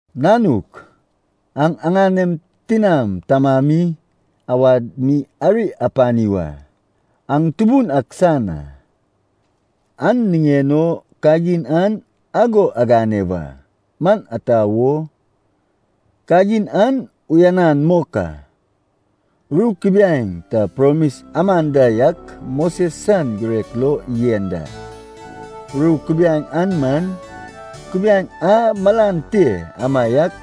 Nanuk, aŋ aŋanem tinam tamami awad mi ari apani wa. Aŋ Tubun ak san a, an niŋen o kagin an ago agane wa. Man ata wo? Kagin an uyanan mok a. Ru kubiaeŋ ta promis aman da yak Moses san girek lo yen da. Ru kubiaeŋ an man, kubiaeŋ a malan te amaiak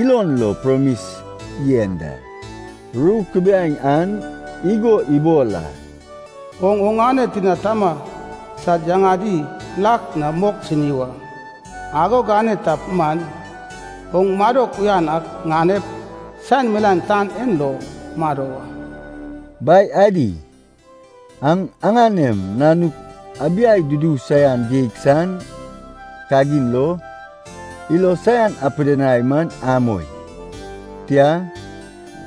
ilon lo promis yen da. Ru kubiaeŋ an igo ibol a, “Oŋ oŋane tina tama sad yaŋadi lak na mok sini wa. Ago gane tap man, oŋ madok uyan ak ŋanep, saen milaen tan en lo mado wa.” Bai adi, aŋ aŋanem nanuk abiai dudu saian geig san kagin lo, ilo saian apidinai man amoi. Tia,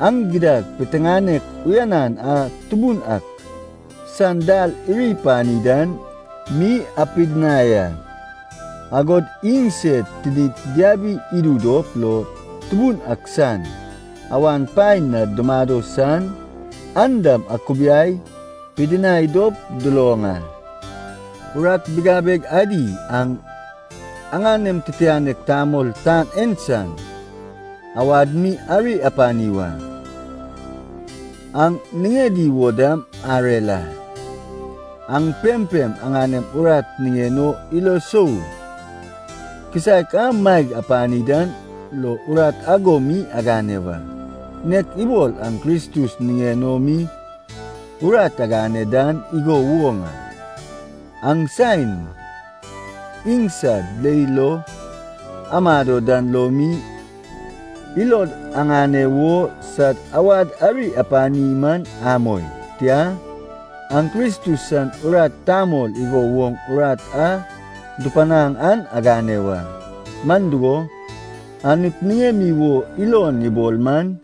aŋ gidad piteŋanek uyanan a Tubun ak san dal iri pani dan mi apidinai a, agod iŋ sed tinid diabi idu dop lo Tubun ak san awan paen na dumado san, an dam akubiai pidinai dop duloŋ a. Urat bigabeg adi aŋ aŋanem titianek tamol tan en san awad mi ari apani wa. Aŋ niŋedi wo dam arer a. Aŋ pempem aŋanem urat niŋen o ilo sou kisaek a maeg apani dan lo urat ago mi agane wa, nek ibol aŋ Kristus niŋen o mi urat agane dan igo woŋ a. Aŋ saen iŋsad leil lo amado dan lo mi, ilod aŋane wo sad awad ari apani man amoi. Tia, aŋ Kristus san urat tamol igo woŋ urat a dupanaŋ an agane wa, man dugo, Anut niŋemi wo ilon ibol man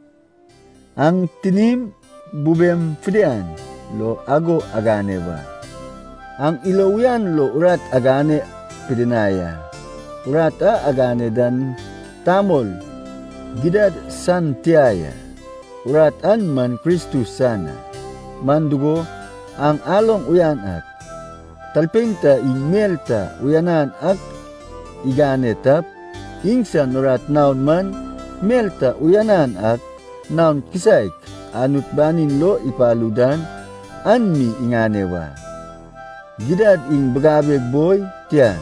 aŋ tinim bubem fidian lo ago agane wa. Aŋ ilo uyan lo urat agane pidinai a, urat a agane dan tamol gidad san tia ya, urat an man Kristus san a. Man dugo aŋ aloŋ uyan ak, talpein ta iŋ mel ta uyanan ak igane tap, iŋsan urat naon man mel ta uyanan ak naon kisaek Anut banin lo ipalu dan an mi iŋane wa. Gidad iŋ bigabeg boi, tia,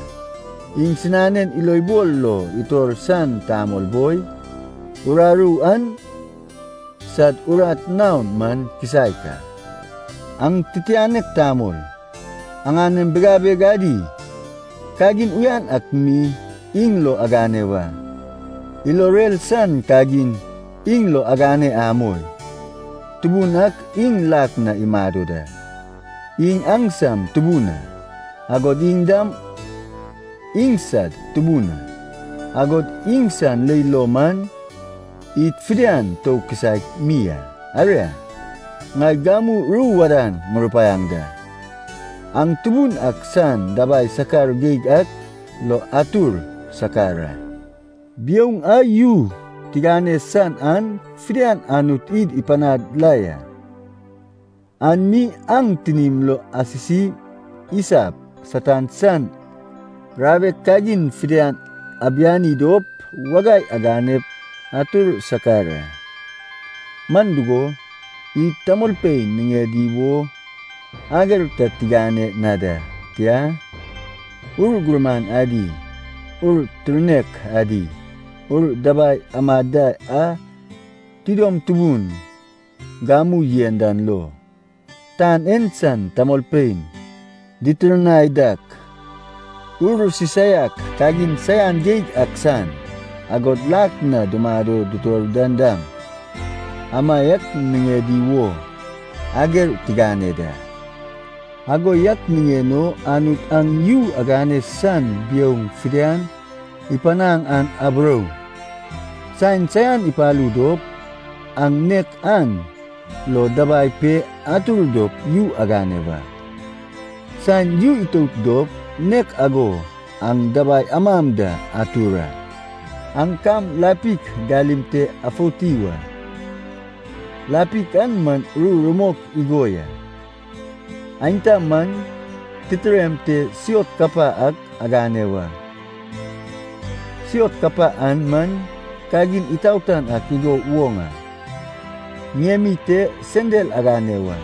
iŋsinanen ilobol lo itor san tamol boi, uraru an sad urat naon man kisaek a. Aŋ titianek tamol, aŋanem bigabeg adi kagin uyan ak mi iŋ lo agane wa. Ilo rer san kagin iŋ lo agane amoi. Tubun ak iŋ lak na imado da, iŋ aŋsam Tubun a, agod iŋ dam iŋsad Tubun a. Agod iŋsan leil lo man, id fidian tou kisaek mi a. Aria, ŋai gamu ru wadan ŋurupaiaŋ da. Aŋ Tubun ak san dabai sakar geig ak lo atur sakar a. Biouŋ a yu tigane san an fidian Anut id ipanad la ya. An mi aŋ tinim lo asisi isap Satan san rawek kagin fidian abiani dop wagai aganep atur sakar a. Man dugo, id tamolpein niŋedi wo ager ta tigane na da, tia, ur gurman adi, ur tirnek adi, ur dabai amad da a tidom tubun gamu yen dan lo, tan en san tamolpein ditirnai dak, ur sisaiak kagin saian geig ak san, agod lak na dumado dutor dan dam, amaiak niŋedi wo ager tigane da. Ago yak niŋen o Anut aŋ yu agane san biouŋ fidian ipanaŋ an aburou, saen saian ipalu dop, aŋ nek an lo dabai pe atur dop yu agane wa. Saen yu itout dop, nek ago aŋ dabai amam da atur a. Aŋ kam lapik galim te afouti wa. Lapik an man ru rumok igo ya. Aenta man, titirem te siot kapa ak agane wa. Siot kapa an man kagin itaotan ak igo woŋ a. Ŋiemi te sendal agane wa.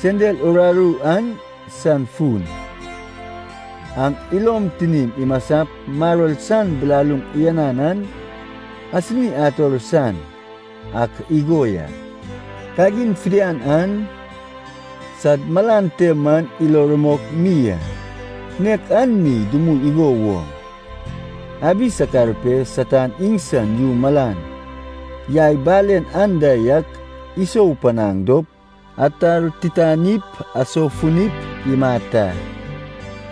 Sendal uraru an san fun, aŋ ilom tinim imasap maror san bilaluŋ uyanan an asini ator san ak igo ya. Kagin fidian an, sad malan te man ilo rumok mi a. Nek an mi dumui igo woŋ, abi sakar pe Satan iŋsan yu malan yai balen anda yak isou ipanaŋ dop atartitanip asoufunip imat a.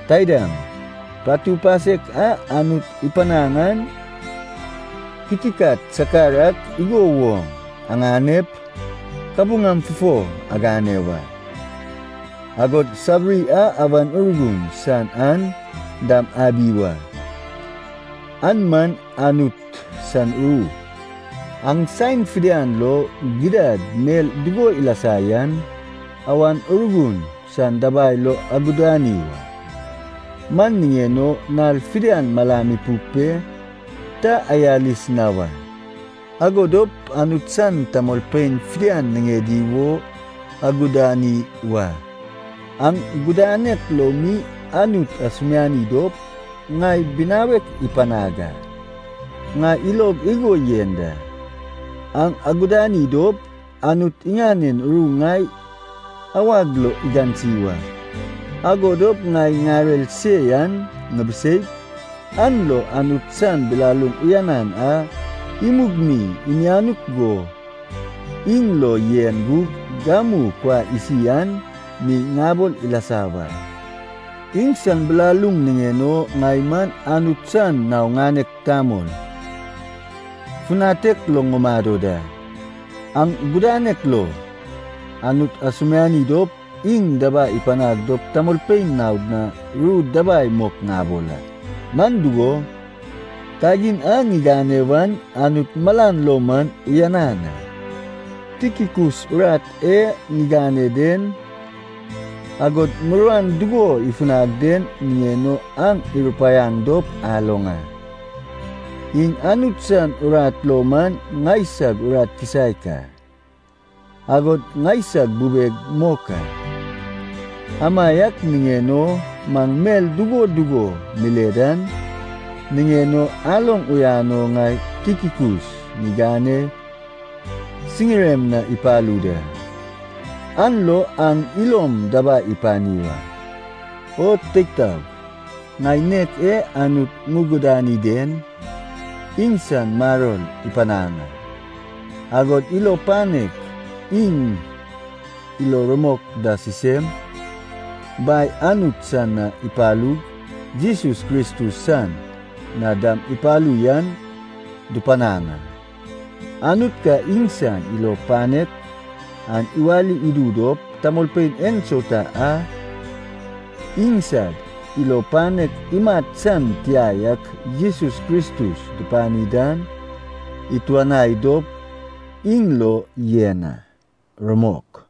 Taidam, patu pasek a Anut ipanaŋ an kitikat sakar ak igo woŋ aŋanep kabuŋam fufo agane wa. Agod sabiri a Awan Urgun san an dam abi wa. An man Anut san ru. Aŋ saen fidian lo, gidad mel dugo ilasa yan, Awan Urgun san dabai lo agudani wa. Man niŋen o nal fidian malam ipuk pe ta ayalis na wa, ago dop Anut san tamolpein fidian niŋedi wo agudani wa. Aŋ gudanek lo mi Anut asumiani dop ŋai binawek ipanag a. Ŋai ilog igo yen da, aŋ agudani dop, Anut iŋanen ru ŋai awag lo igansi wa. Ago dop ŋai ŋarer se yan ŋibiseip, an lo Anut san bilaluŋ uyanan a imug mi imianuk go iŋ lo yen gug gamu kuai isi an mi ŋabol ilasa wa. Iŋsan bilaluŋ niŋen o ŋai man Anut san nao ŋanek tamol, funatek lo ŋumado da. Aŋ gudanek lo Anut asumiani dop iŋ dabai ipanag dop tamolpein naod na ru dabai mok ŋabol a, man dugo, kagin an ŋigane wan Anut malan lo man uyanan a. Tikikus urat e ŋigane den, agod muruan dugo ifunag den niŋen o aŋ irupaiaŋ dop aloŋ a. Iŋ Anut san urat lo man ŋaisag urat kisaek a, agod ŋaisag bubeg mok a. Amaiak niŋen o maŋ mel dugo dugo mile dan niŋen o aloŋ uyan o ŋai Tikikus ŋigane siŋirem na ipalu da. An lo aŋ ilom dabai ipani wa. O teig taog, ŋai nek e Anut ŋugudani den, iŋsan maror ipanaŋ a, agod ilo panek iŋ ilo rumok da sisem, Bai Anut san na ipalug, Jesus Kristus san na dam ipalu yan dupanaŋ a. Anut ka iŋsan ilo panek an iwali idu dop, tamolpein ensauta a iŋsad ilo panek imat san tia yak Jesus Kristus dupani dan ituanai dop iŋ lo yen a. Rumok.